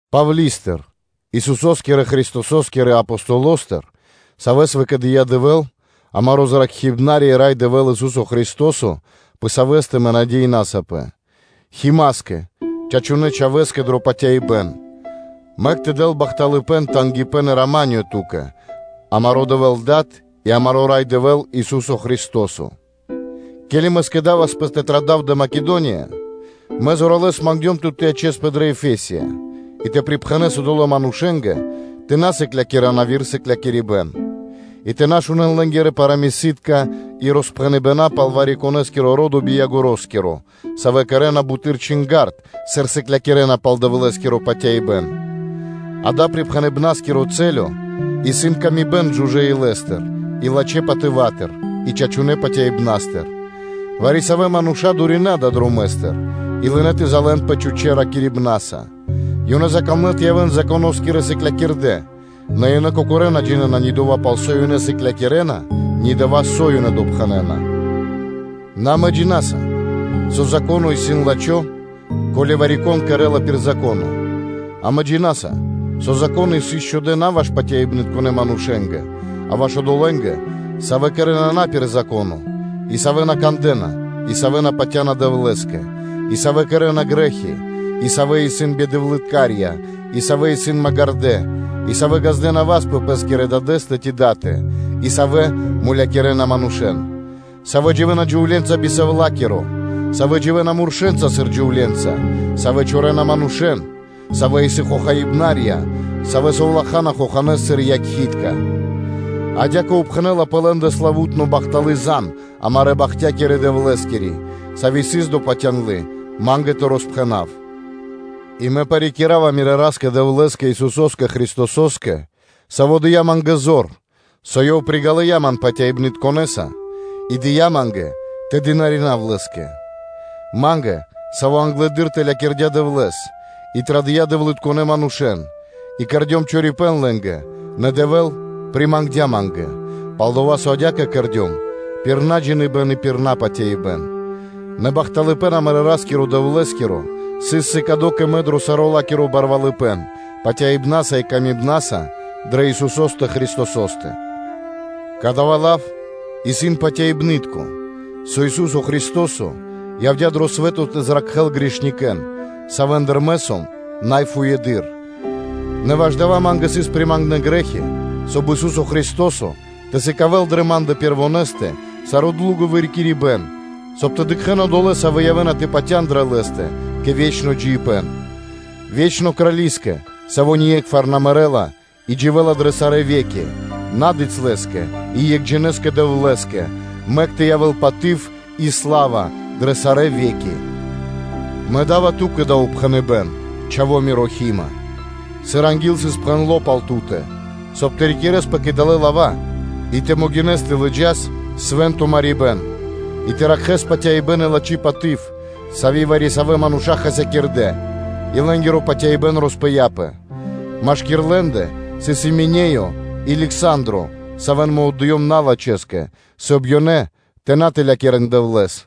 Павли́стыр, Исусо́скирэ-Христосо́скирэ Апостолостыр, савэ́с выкэдыя́ Дэвэ́л, амаро́ Зракхибнари (Спасителё) и Рай Дэвэ́л, Ису́со Христо́со, пэ савэ́стэ мэ надеинасапэ, Химаскэ, чачунэ́ чхавэ́скэ дро патяибэ́н: мэк тэ дэл бахталыпэ́н, тангипэ́н и рама́нё ту́кэ, амаро́ Дэвэ́л Дад и амаро́ Рай Дэвэ́л, Ису́со Христо́со. Ке́ли мэ скэдаваспэ тэ традав кэ Македония, мэ зоралэ́с мангдём тут тэ ячэспэ дрэ Ефесия и тэ припхэнэс одолэ́ манушэ́нгэ тэ на сыклякирэ́н яви́р сыклякирибэ́н, и тэ на шунэ́н лэ́нгирэ парамыси́тка и роспхэныбэна пал вари-конэ́скиро ро́до би концоскиро (би ягороскиро), савэ́ кэрэ́на буты́р чинга́рд, сыр сыклякирэ́на пал Дэвлэ́скиро патяибэ́н. Дава́ припхэныбнаскиро чачипэ́н исын дро паты́в кэ яви́р мануша́ жужэ́ илэ́стыр и лачхэ́ патыватыр и чачунэ́ патяибнастыр, вари-савэ́ мануша́ дуринэ далэ́ дромэ́стыр, и лынэ́ тэ залэнпэ чхучэ́ (пустонэ) ракирибнаса, ёнэ закамлэ тэ явэ́н Законо́скирэ сыклякирдэ́, нэ ёнэ кокорэ́ на джинэ́на ни дова́, пал со ёнэ ракирэ́на, ни дова́, со ёнэ допхэнэна. Нэ амэ джина́са, со Зако́но исын лачхо́, ко́ли вари-кон кэрэ́ла пир Зако́но, амэ джина́са, со Зако́ны исын счхудэ на ваш патяибнытконэ манушэ́скэ, а ваш одолэ́нгэ, савэ́ кэрэ́на на пир Зако́но, и савэ́ на кандэ́на, и савэ́ на патя́на Дэвлэ́скэ, и савэ́ кэрэ́на грэ́хи, и савэ́ исын бидэвлыткарья, и савэ́ исын магирдэ́, и савэ́ ґаздэ́на васт пэ пэ́скирэ дадэ́стэ ци датэ, и савэ́ мулякирэна манушэ́н, савэ́ дживэ́на джувле́нца би сэвлакиро, савэ́ дживэ́на муршэнца сыр джувле́нца, савэ́ чорэна манушэ́н, савэ́ исын хохаибнарья, савэ́ совлахана хоханэ́с сыр якхи́тка. Адя́кэ упхэнэла пэ лэ́ндэ славу́тно бахталы́ зан амарэ́ бахтякирдэ Дэвлэ́скири, сави́ сыс допатяндлы ма́нгэ тэ роспхэнав. И мэ парикирава мирэ́ Ра́скэ-Дэвлэ́скэ, Исусо́скэ Христосо́скэ, Саво́ дыя́ ма́нгэ зор, со Ёв приґалыя ман патяибнытконэса и дыя́ ма́нгэ тэ дынаринав Лэ́скэ, ма́нгэ, саво́ англэды́р тэлякирдя Дэвлэ́с, и традыя́ дэвлытконэ́ манушэ́н, и кэрдём чорипэ́н лэ́нгэ: нэ Дэвэ́л примангдя ма́нгэ, пал-дова́ со адя́кэ кэрдём пир наджиныбэн и пир напатяибэн. Нэ бахталыпэ́н амарэ́ Ра́скиро-Дэвлэ́скиро сыс сыкадо кэ мэ дро саро́ ла́киро барвалыпэ́н, выкэдыибнаса и илэ́са дрэ Исусо́стэ Христосо́стэ. Кадава́ лав исын патяибны́тко, со Ису́со Христо́со явдя́ дро свэ́то тэ зракхэ́л грехитконэ́н, савэ́ндыр мэ сом най фуеды́р. Нэ ваш дава́ ма́нгэ сыс примангнэ грэ́хи, соб (кай) Ису́со Христо́со тэ сыкавэ́л дрэ ма́ндэ пэрвонэстэ саро́ длуго вырикирибэн, соб (кай) тэ дыкхэ́н одолэ́, савэ́ явэ́на тэ патя́н дрэ Лэ́стэ кэ ве́чно джиибэ́н. Вечнонэ Крали́скэ, саво́ ние́кхвар на мэрэ́ла и дживэ́ла дрэ сарэ́ ве́ки, Набицялэскэ и Екхджинэскэ Дэвлэ́скэ, мэк тэ явэ́л паты́в и сла́ва дрэ сарэ́ ве́ки. Мэ да́ва ту́кэ дава́ упхэныбэ́н, чха́ва миро Хима, сыр анги́л сыс пхэндло́ пал ту́тэ, соб (кай) тэ рикирэспэ кэ далэ́ лава́ и тэ могинэс тэ лыджас свэ́нто марибэ́н, и тэ ракхэ́с патяибэ́н и лачхи́ паты́в, сави́ вари-савэ́ мануша́ хасякирдэ́, и лэ́нгиро патяибэ́н роспыяпэ, машки́р лэ́ндэ сыс Именеё и Лександро (Александро), савэ́н мэ отдыём налачхэскэ, соб (кай) ёнэ тэ на тэлякирэн Дэвлэ́с.